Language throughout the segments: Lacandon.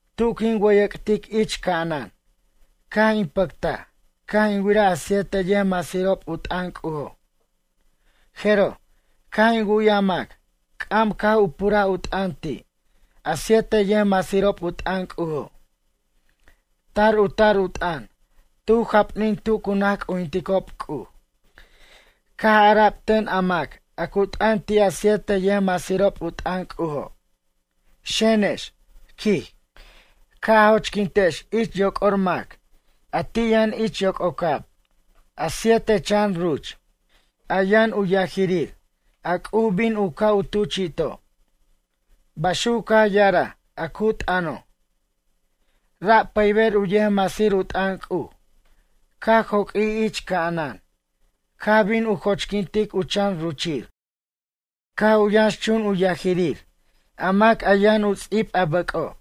Tu quin wʌyʌc'tic ich ca'anan, caj in pʌctaj caj in wiraj a siete yʌjmasirob u t'ʌn C'ujo'. Jeroj, caj in wu'yaj mac c'am caj u puraj u t'ʌn ti' a siete yʌjmasirob u t'ʌn C'ujo'. Tar u tar u t'ʌn tu japnin tu cu naj c'ujinticob C'uj. Caj ara'b ten a mac a cu t'ʌn ti' a siete yʌjmasirob u t'ʌn C'ujo': ―Xenex ―quij―, ca' a jochquintex ich yoc'or mac a ti' yʌn ich yoc'ocab, a siete chan ruch, a yʌn u yajirir a C'uj bin u ca' u tuchi'to' ―baxuc caj ya'araj a cu t'ʌno'. Ra' pʌyber u yʌjmasir u t'ʌn C'uj caj joq'uij ich ca'anan caj bin u jochquint u chan ruchir, caj u yʌnxchun u yajirir a mac a yʌn u ts'ib a bʌc'o',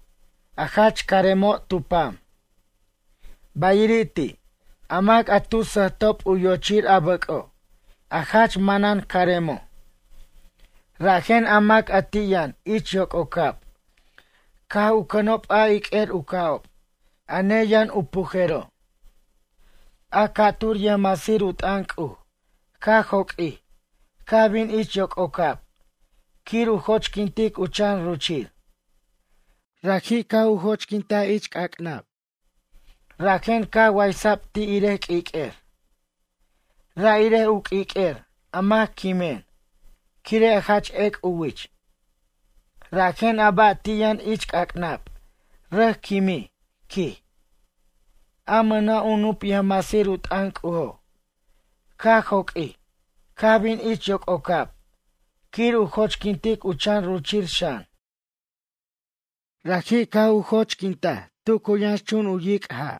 a jach caremo' tu pam. Bayiri' ti', a mac a tu sʌjtob u yochir a bʌc'o', a jach manan caremo'. Rajen a mac a ti' yʌn ich yoc'ocab caj u cʌnob a iq'uer u ca'ob, a neyʌn u pujero'. A ca'tur u yʌjmasir u t'ʌn C'uj caj joq'uij, caj bin ich yoc'ocab quir u jochquint u chan ruchir. Raji' caj u jochquint ich c'ac'nab, rajen caj waysa'b ti' irej q'uiq'uer, ra' irej u q'uiq'uer a mac quimen quire' jach ec' u wich. Rajen a ba' ti' yʌn ich c'ac'nab rʌc quimij, quij. A mʌna' u nup yʌjmasir u t'ʌn C'ujo', caj joq'uij caj bin ich yoc'ocab quir u jochquint u chan ruchir xan. Raji' caj u jochquin tu cu yʌnxchun u yic' ja',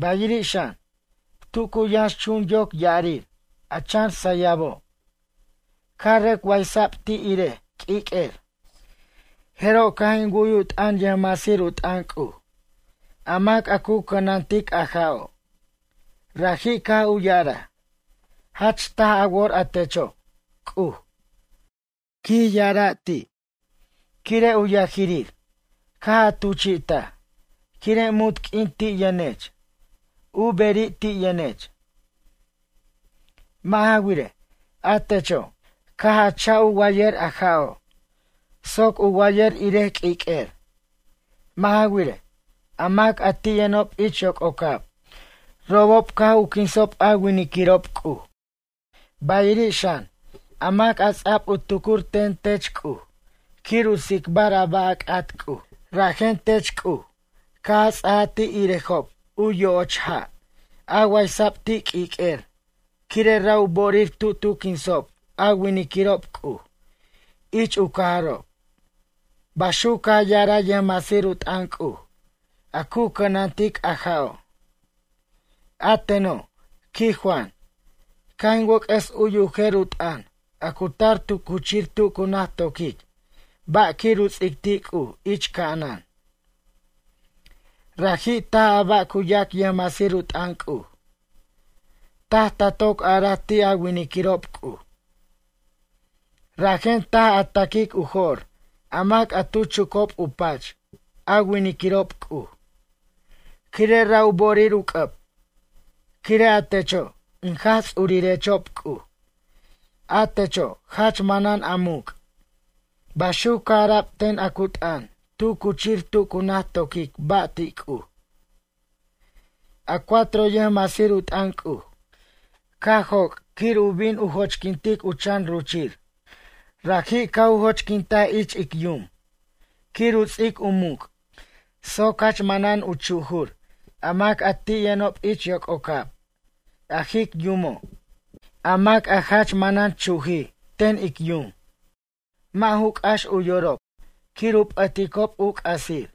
bayiri' xan, tu cu yʌnxchun yoc ya'arir a chan sʌyabo' caj rʌc waysa'b ti' irej q'uiq'uer. Jeroj, caj in wu'y u t'ʌn yʌjmasir u t'ʌn C'uj, a mac a cu cʌnantic a ja'o'. Raji' caj u ya'araj: ―Jach taj a wor a techo', C'uj ―quij ya'araj ti'―, quire' u yajirir caj a tuchi'taj, quire' munt q'uin ti' yʌnech, u beri' ti' yʌnech. Mʌ' ja wirej, a techo', caj a cha'b u wayʌr a ja'o', soc u wayʌr irej q'uiq'uer. Mʌ' ja wirej, a mac a ti' yʌnob ich yoc'ocab, robob caj u quinsob a winiquirob C'uj, bayiri' xan, a mac a ts'a'b u tucur ten tech C'uj quir u tsicbar a ba' a c'at C'uj. Rajen tech C'uj caj a ts'aja ti' irejob u yo'och ja' a waysa'b ti' q'uiq'uer quire' ra' u bo'orir tu tu quinsob a winiquirob C'uj ich u cajarob ―baxuc caj ya'araj yʌjmasir u t'ʌn C'uj a cu cʌnantic a ja'o'. A teno', quij Juan, caj in wʌc'ʌs u'y u jer u t'ʌn a cu tar tu cuchir tu cu naj to'quic ba' quir u ts'ic ti C'uj ich ca'anan: ―Raji' taj a ba' cu yac yʌjmasir u t'ʌn C'uj. Taj ta toc araj ti' a winiquirob C'uj, rajen taj tan a taquic u jo'r a mac a tu chucob u pach a winiquirob C'uj, quire' ra' u bo'orir u c'ʌb, quire' a techo' in Jaj Ts'urirechob C'uj, a techo' jach manan a muc' ―baxuc caj ara'b ten a cu t'ʌn tu cuchir tu cu naj to'quic ba' ti' C'uj. A cuatro yʌjmasir u t'ʌn C'uj, caj joc' quir u bin u jochquint u chan ruchir. Raji' caj u jochquintaj ich ic yum quir u ts'ic u muc' soc jach manan u chujur a mac a ti' yʌnob ich yoc'ocab, a jic yumo'. A mac a jach manan chujij ten ic yum, mʌ' ju c'ax u yorob quir u p'ʌticob u c'asir,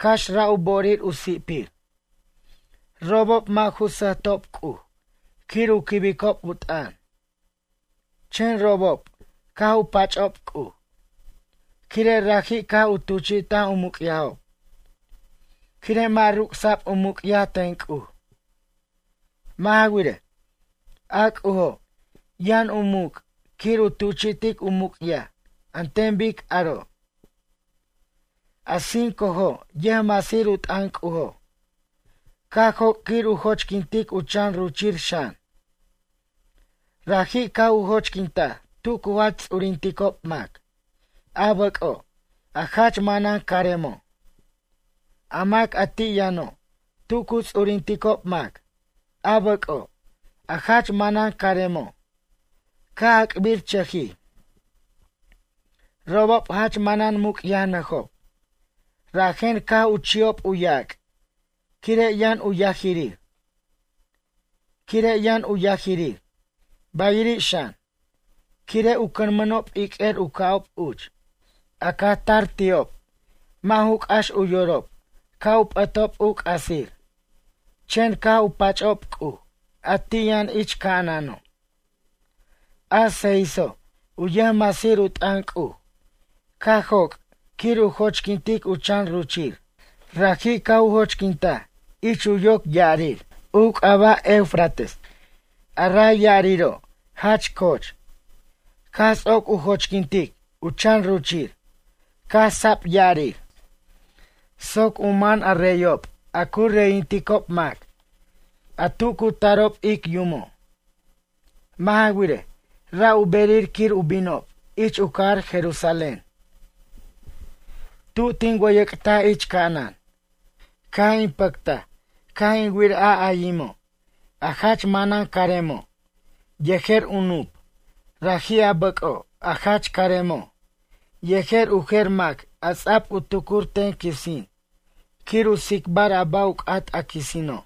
cax ra' u bo'orir u si'pir. Robob mʌ' ju sʌjtob C'uj quir u quibicob u t'ʌn. Chen robob caj u pach'ob C'uj, quire' raji' caj u tuchi'taj u muc'yajob, quire' mʌ' ruc'sa'b u muc'yaj ten C'uj. Mʌ' ja wirej, a C'ujo' yʌn u muc' quir u tuchi'tic u muc'yaj an ten bic aro'. A cincojo' yʌjmasir u t'ʌn C'ujo', caj joc' quir u jochquintic u chan ruchir xan. Raji' caj u jochquintaj tu cu jach ts'urinticob mac, a bʌc'o', a jach manan caremo'. A mac a ti' yʌno', tu cu ts'urinticob mac a bʌc'o', a jach manan caremo' caj ac'birchʌjij. Robob jach manan muc'yajnʌjob, rajen caj u chi'ob u yac' quire' yʌn u yajirir. Quire' yʌn u yajirir, bayiri' xan, quire' u cʌnmʌnob iq'uer u ca'ob uch, a caj tar ti'ob, mʌ' ju c'ax u yorob ca' u p'ʌtob u c'asir, chen caj u pach'ob C'uj a ti' yʌn ich ca'anano'. A seiso' u yʌjmasir u t'ʌn C'uj, caj joc' quir u jochquintic u chan ruchir. Raji' caj u jochquintaj ich u yoc ya'arir u c'aba' Eufrates, a ray ya'ariro' jach coch. Caj ts'oc u jochquintic u chan ruchir caj sa'b ya'arir soc u man a reyob a cu reyinticob mac a tu cu tarob ic yumo'. Mʌ' ja wirej, ra' u berir quir u binob ich u cajar Jerusalén. Tu tin wʌyʌc'taj ich ca'anan, caj in pʌctaj caj in wir a ayimo', a jach manan caremo', yejer u nup, raji' a bʌc'o', a jach caremo', yejer u jer mac a ts'a'b u tucur ten quisin quir u tsicbar a ba' u c'at a quisinob.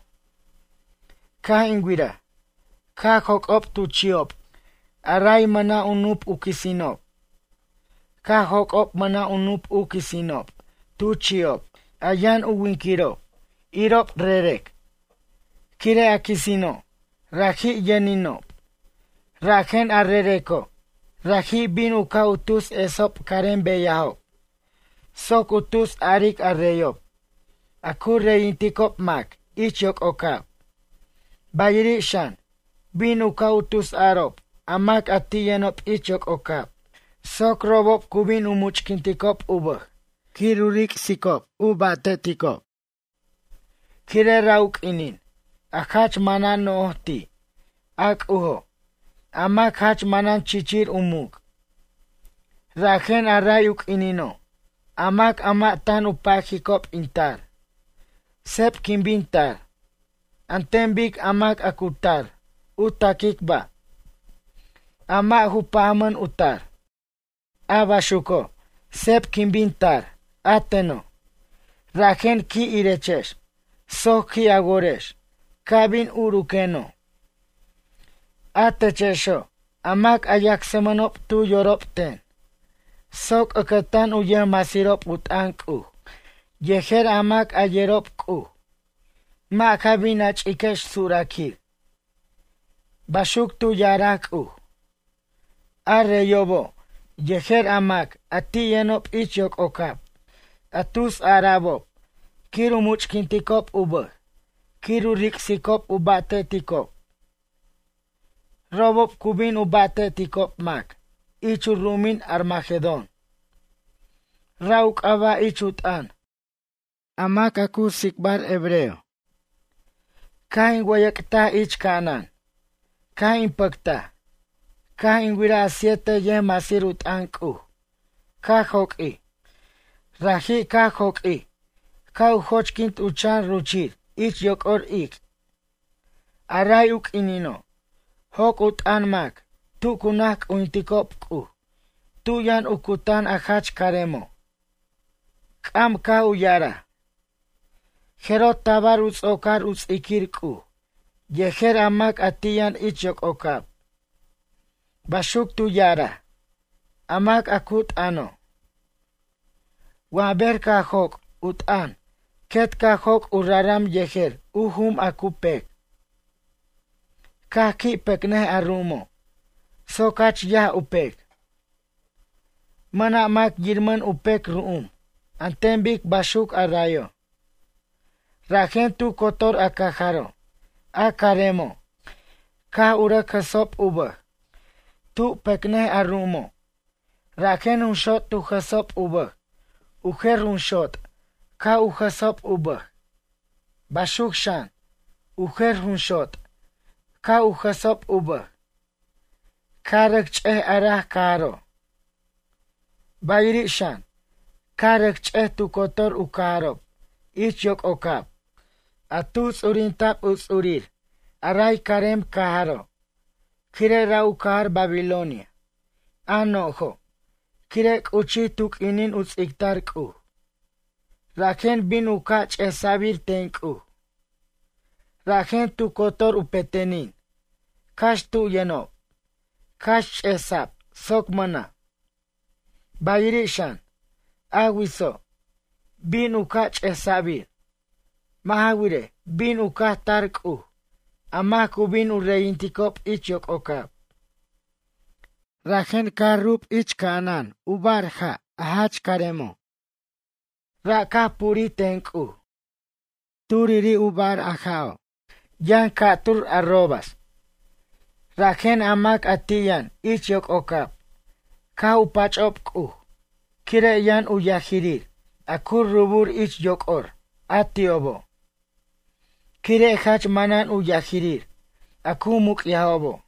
Caj in wiraj caj joc'ob tu chi'ob a ray mʌna' u nup u quisinob. Caj joc'ob mʌna' u nup u quisinob tu chi'ob a yʌn u winquirob irob rerec. Quire' a quisino', raji' yʌninob, rajen a rereco' raji' bin u ca' u tus esob carem beyajob soc u tus aric a reyob, a cu reyinticob mac ich yoc'ocab, bayiri' xan, bin u ca' u tus arob a mac a ti' yʌnob ich yoc'ocab soc robob cu bin u much'quinticob u bʌj quir u ric'sicob u ba'te'ticob, quire' ra' u q'uinin a jach manan no'j ti' a C'ujo', a mac a jach manan chichir u muc'. “Rajen a ray u q'uinino', a mac a mʌ' tan u pajicob in tar, seb quin bin tar, an ten bic a mac a cu tar u ta'quic ba', a mʌ' u pajmʌn u tar. A baxuco', seb quin bin tar, a teno'. Rajen qui' irechex soc qui' a worex ca' bin uruqueno', a techexo' a mac a yacsmʌnob tu yorob ten, soc ʌcʌtan u yʌjmasirob u t'ʌn C'uj yejer a mac a yerob C'uj, mʌ' ja bin a ch'iquex suraquir.” Baxuc tu ya'araj C'uj. A reyobo', yejer a mac a ti' yʌnob ich yoc'ocab, a tus ara'bob quir u much'quinticob u bʌj quir u ric'sicob u ba'te'ticob. Robob cu bin u ba'te'ticob mac ich u ru'umin Armagedón, ra' u c'aba' ich u t'ʌn a mac a cu tsicbar hebreo. Caj in wʌyʌc'taj ich ca'anan, caj in pʌctaj, caj in wiraj a siete yʌjmasir u t'ʌn C'uj caj joq'uij. Raji' caj joq'uij caj u jochquint u chan ruchir ich yoc'or ic'. A ray u q'uinino', joc' u t'ʌn mac tu cu naj c'ujinticob C'uj tu yʌn u cutan a jach caremo'. C'am caj u ya'araj: ―Jeroj tabar u ts'ocar u ts'iquir C'uj yejer a mac a ti' yʌn ich yoc'ocab ―baxuc tu ya'araj a mac a cu t'ʌno'. Wa ber caj joc' u t'ʌn quet caj joc' u raram yejer u jum a cu pec, caj qui' pecnʌj a ru'umo' soc jach yaj u pec. Mʌna' mac yirmʌn u pec ru'um an ten bic baxuc a rayo'. Rajen tu cotor a cajaro' a caremo' caj u rʌc jʌsob u bʌj, tu pecnʌj a ru'umo', rajen junxot tu jʌsob u bʌj u jer junxot caj u jʌsob u bʌj, baxuc, xan, u jer junxot caj u jʌsob u bʌj. Caj rʌc ch'ej a raj cajaro', bayiri' xan caj rʌc ch'ej tu cotor u cajarob ich yoc'ocab a tuj ts'urinta'b u ts'urir a ray carem cajaro' quire' ra' u cajar Babilonia, a no'jo', quire' c'uchij tu q'uinin u ts'ictar C'uj. Rajen bin u ca' ch'esa'bir ten C'uj. Rajen tu cotor u pe'tenin, cax tu yʌnob, caj ch'esa'b soc mʌna', bayiri' xan, a witso', bin u ca' ch'esa'bir. Mʌ' ja wirej, bin u caj tar C'uj, a mac cu bin u reyinticob ich yoc'ocab. Rajen caj rub ich ca'anan bar ja', a jach caremo'. Ra' caj purij ten C'uj. Turiri' a bar a ja'o', yʌn ca'tur' arrobas. Rajen a mac a ti' yʌn ich yoc'ocab caj u pach'ob C'uj quire' yʌn u yajirir a cu rubur ich yoc'or a ti'obo'. Quire' jach manan u yajirir a cu muc'yajobo'.